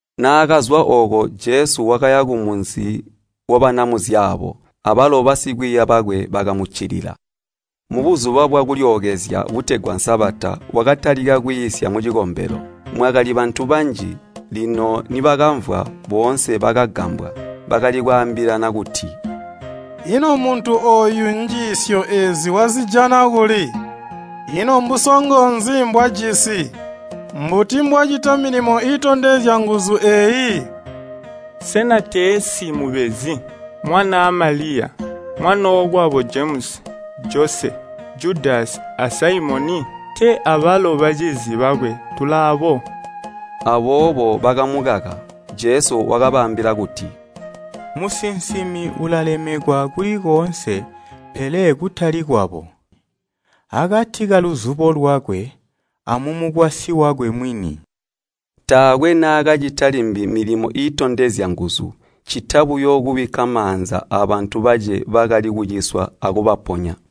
Naakazwa ooko, Jesu wakaya kumunzi wabanamuzyaabo, abalo basikwiiya bakwe bakamuccilila. Mu Buzuba bwa Kulyookezya butegwa Sabata wakatalika kwiisya mucikombelo. Mwakali bantu banji, lino nibakamvwa, boonse bakagambwa. Bakali kwaambilana kuti, “Ino muntu ooyu njiisyo eezi wazijana kuli? Ino mbusongo nzi mbwajisi? Mbuti mbwacita milimo iitondezya nguzu eeyi? Sena teesi mubezi, mwanaa Maliya, mwanookwabo Jemusi, Jose, Judasi a Saimoni? Tee abalo bacizi bakwe tulaabo.” Aboobo bakamukaka. Jesu wakabaambila kuti, “Musinsimi ulalemekwa kuli koonse pele kutali kwabo, kati kaluzubo lwakwe, amumukwasyi wakwe mwini.” Taakwe naakacita limbi milimo iitondezya nguzu, ccita buyo kubikka maanza abantu bace bakali kuciswa akubaponya.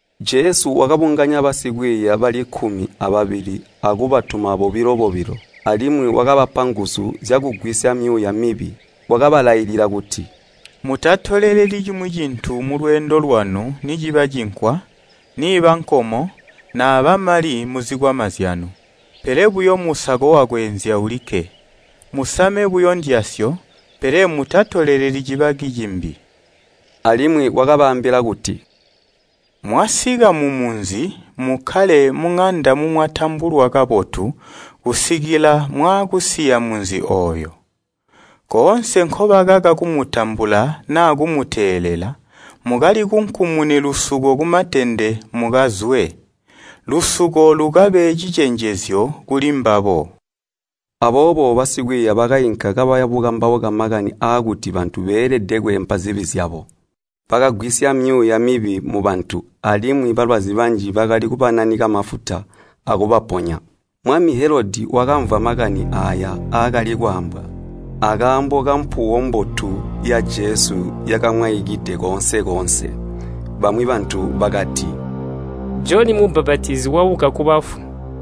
Jesu wakabunganya basikwiiya bali kkumi ababili akubatuma bobilo-bobilo, alimwi wakabapa nguzu zyakugwisya myuuya mibi. Wakabalailila kuti, “Mutatoleleli cimwi cintu mulweendo lwanu niciba cinkwa, niiba nkomo, naaba mali muzikwama zyanu, pele buyo musako wakweenzya ulikke. Musame buyo ndyasyo, pele mutatoleleli cibaki cimbi.” Alimwi wakabaambila kuti, “Mwasika mumunzi, mukkale muŋanda mumwatambulwa kabotu kusikila mwaakusiya munzi ooyo. Koonse nkobakaka kumutambula naa kumuteelela, mukalikunkumune lusuko kumatende mukazwe. Lusuko lukabe cicenjezyo kulimbabo!” Aboobo basikwiiya bakainka kabaya bukambauka makani aakuti bantu beelede kweempa zibi zyabo. Bakagwisya myuuya mibi mubantu, alimwi balwazi banji bakali kubananika mafuta akubaponya. Mwami Helodi wakamvwa makani aaya aakali kwaambwa akaambo kampuwo mbotu ya Jesu yakamwaikide koonse-koonse. Bamwi bantu bakati, “Joni Mubbapatizi wabuka kubafu!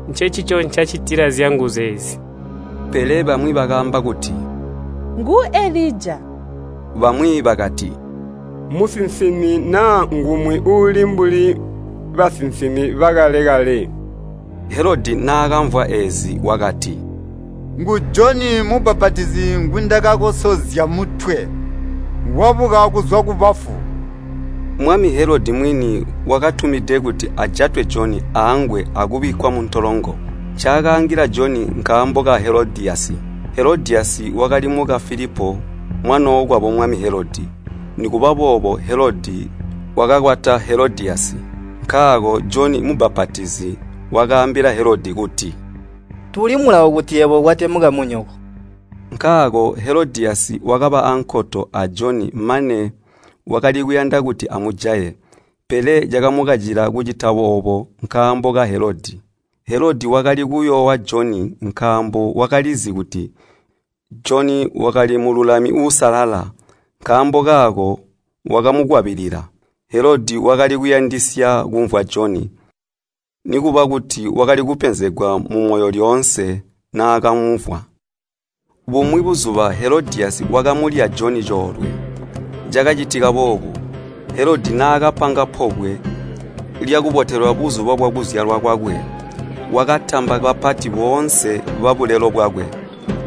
Ncencico ncacitila zyanguzu eezi.” Pele bamwi bakaamba kuti, “Ngu Elija.” Bamwi bakati, “Musinsimi naa ngumwi uulu mbuli basinsimi bakale-kale.” Helodi naakamvwa eezi, wakati, “Ngu Joni Mubbapatizi ngwindakakosozya mutwe, wabuka kuzwa kubafu!” Mwami Helodi mwini wakatumide kuti ajatwe Joni aangwe akubikkwa muntolongo. Ncaakaangila Joni nkaambo ka Helodiyasi. Helodiyasi wakali muka Filipo mwanookwabo mwami Helodi, nikuba boobo Helodi wakakwata Helodiyasi. Nkaako Joni Mubbapatizi wakaambila Helodi kuti, “Tuuli mulawo kuti yebo ukwate mukamunyoko!” Nkaako Helodiyasi wakaba aankoto a Joni mane wakali kuyanda kuti amujaye, pele cakamukacila kucita oobo nkaambo ka Helodi. Helodi wakali kuyoowa Joni nkaambo wakalizi kuti Joni wakali mululami uusalala, nkaambo kaako wakamukwabilila. Helodi wakalikuyandisya kumvwa Joni, nikuba kuti wakali kupenzegwa mumoyo lyoonse naakamumvwa. Bumwi buzuba Helodiyasi wakamulya Joni coolwe. Cakacitika boobu, Helodi naakapanga pobwe lyakubotelwa buzuba bwakuzyalwa kwakwe, wakatamba bapati boonse babulelo bwakwe,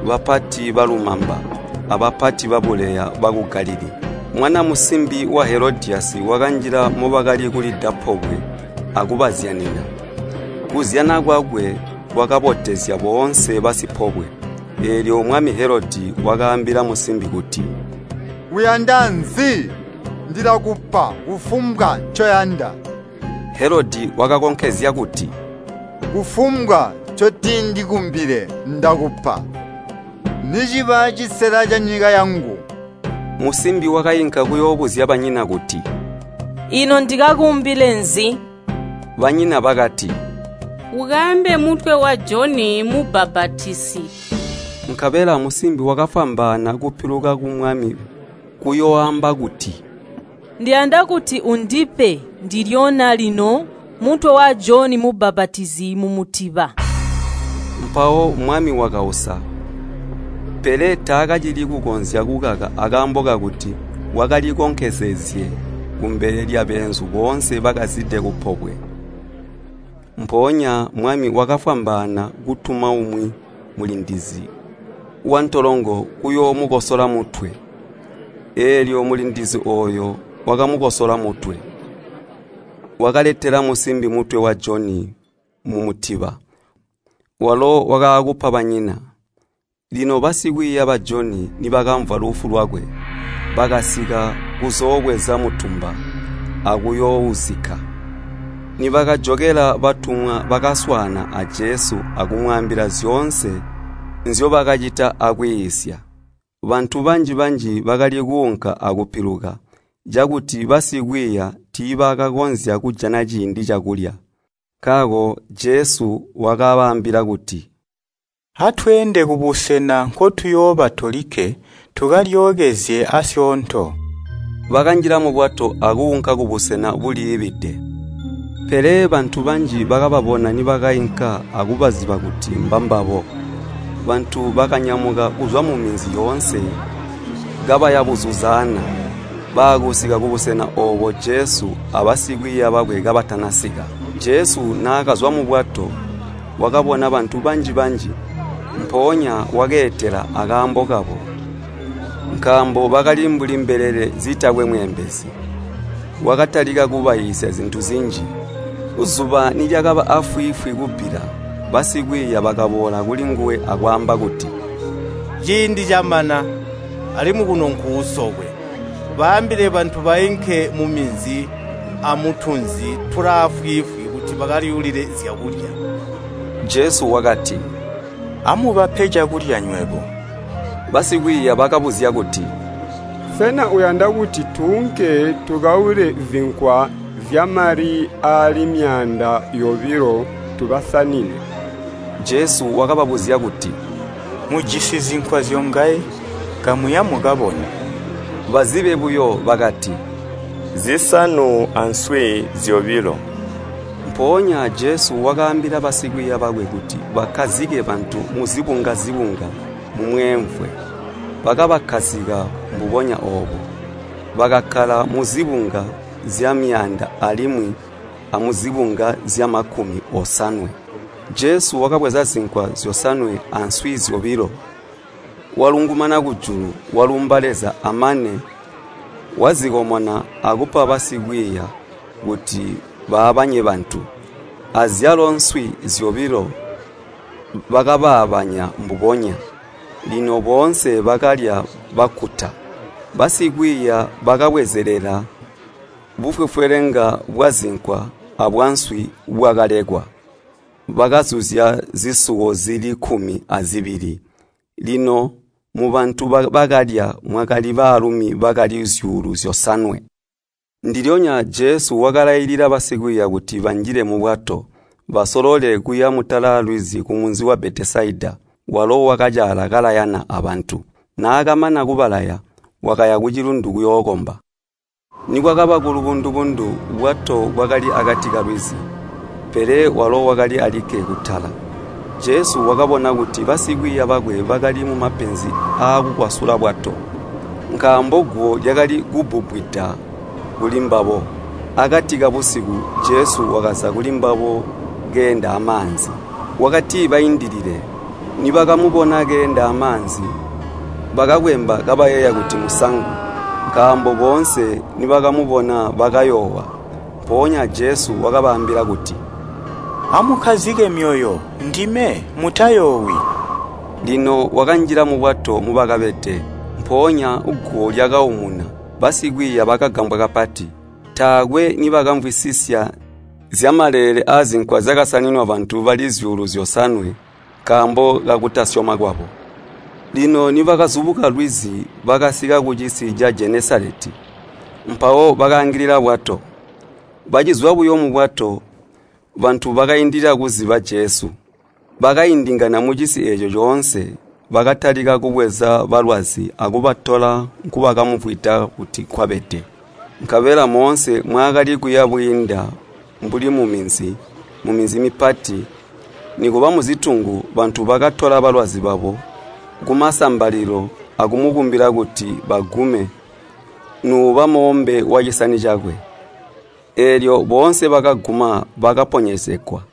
bapati balumamba, abapati babuleya baku Galilii. Mwana musimbi wa Helodiyasi wakanjila mobakali kulida pobwe akubazyanina. Kuzyana kwakwe kwakabotezya boonse basipobwe. Eelyo mwami Helodi wakaambila musimbi kuti, “Uyanda nzi? Ndilakupa kufumbwa ncoyanda.” Helodi wakakonkezya kuti, “Kufumbwa ncotindikumbile ndakupa, niciba cisela canyika yangu!” Musimbi wakainka kuyoobuzya banyina kuti, “Ino ndikakumbile nzi?” Banyina bakati, “Ukaambe mutwe wa Joni Mubbapatizi.” Nkabela musimbi wakafwambaana kupiluka kumwami kuyooamba kuti, “Ndiyanda kuti undipe ndilyonya lino mutwe wa Joni Mubbapatizi mumutiba.” Mpawo mwami wakausa, pele taakacili kukonzya kukaka akaambo kakuti wakalikonkezezye kumbele lyabeenzu boonse bakazide kupobwe. Mpoonya mwami wakafwambaana kutuma umwi mulindizi wantolongo kuyoomukosola mutwe. Eelyo mulindizi ooyo wakamukosola mutwe. Wakaletela musimbi mutwe wa Joni mumutiba, walo wakaakuupa banyina. Lino basikwiiya ba Joni nibakamvwa lufu lwakwe, bakasika kuzoobweza mutumba akuyoouzikka. Nibakajokela batumwa bakaswaana a Jesu akumwaambila zyoonse nzyobakacita akwiisya. Bantu banji-banji bakali kuunka akupiluka, cakuti basikwiiya tiibakakonzya kujana ciindi cakulya. Nkaako Jesu wakabaambila kuti, “Atweende kubusena nkotuyooba tolikke tukalyookezye aasyoonto.” Bakanjila mubwato akuunka kubusena buliibide. Pele bantu banji bakababona nibakainka akubaziba kuti mbambabo, bantu bakanyamuka kuzwa muminzi yoonse kabaya buzuzaana, baakusika kubusena oobo Jesu abasikwiiya bakwe kabatana sika. Jesu naakazwa mubwato, wakabona bantu banji-banji, mpoonya wakeetela akaambo kabo, nkaambo bakali mbuli mbelele zitakwe mweembezi. Wakatalika kubaiisya zintu zinji. Zuba nilyakaba aafwiifwi kubbila, basikwiiya bakaboola kulinguwe akwaamba kuti, “Ciindi camana, alimwi kuno nkuusokwe. Baambile bantu bainke muminzi amutunzi tulaafwiifwi kuti bakalyuulile zyakulya.” Jesu wakati, “Amubape cakulya nywebo.” Basikwiiya bakabuzya kuti, “Sena uyanda kuti tuunke tukaule zinkwa zyamali aali myaanda yobilo tubasanine?” Jesu wakababuzya kuti, “Mujisi zinkwa zyongaye? Kamuya, mukabone.” Bazibe buyo, bakati, “Nzisanu answi zyobilo.” Mpoonya Jesu wakaambila basikwiiya bakwe kuti bakkazike bantu muzibunga-zibunga mumweemvwe. Bakabakkazika mbubonya oobo. Bakakkala muzibunga zyamyaanda alimwi amuzibunga zyamakumi osanwe. Jesu wakabweza zinkwa zyosanwe answi zyobilo, walungumana kujulu, walumba Leza amane wazikomona akupa basikwiiya kuti baabanye bantu, azyalo nswi zyobilo bakabaabanya mbubonya. Lino boonse bakalya bakkuta. Basikwiiya bakabwezelela bufwefwelenga bwazinkwa abwanswi bwakalekwa, bakazuzya zisuwo zili kkumi azibili. Lino mubantu bakalya mwakali baalumi bakali zyuulu zyosanwe. Ndilyonya Jesu wakalailila basikwiiya kuti banjile mubwato, basolole kuya mutala lwizi kumunzi wa Betesaida, walo wakacaala kalayana abantu. Naakamana kubalaya, wakaya kucilundu kuyookomba. Nikwakaba kulubundu-bundu, bwato bwakali akati kalwizi, pele walo wakali alikke kutala. Jesu wakabona kuti basikwiiya bakwe bakali mumapenzi aakukwasula bwato, nkaambo guwo lyakali kubbubbwida kulimbabo. Akati kabusiku, Jesu wakaza kulimbabo keenda amaanzi. Wakatibaindilile. Nibakamubona keenda amaanzi, bakakwemba kabayeeya kuti musangu. Nkaambo boonse nibakamubona, bakayoowa. Mpoonya Jesu wakabaambila kuti, “Amukkazike myoyo! Ndime. Mutayoowi!” Lino wakanjila mubwato mubakabede. Mpoonya guwo lyakaumuna. Basikwiiya bakagambwa kapati. Taakwe nibakamvwisisya zyamaleele aazinkwa zyakasaninwa bantu bali zyuulu zyosanwe nkaambo kakutasyoma kwabo. Lino nibakazubuka lwizi bakasika kucisi ca Jenesaleti, mpawo bakaangilila bwato. Bacizwa buyo mubwato, bantu bakaindilila kuziba Jesu. Bakaindingana mucisi eeco coonse, bakatalika kubweza balwazi akubatola nkubakamumvwida kuti nkwabede. Nkabela moonse mwaakali kuya bwiinda mbuli muminzi, muminzi mipati, nikuba muzitungu bantu bakatola balwazi babo kumasambalilo akumukumbila kuti bagume nuuba moombe wacisani cakwe. Eelyo boonse bakaguma bakaponyezegwa.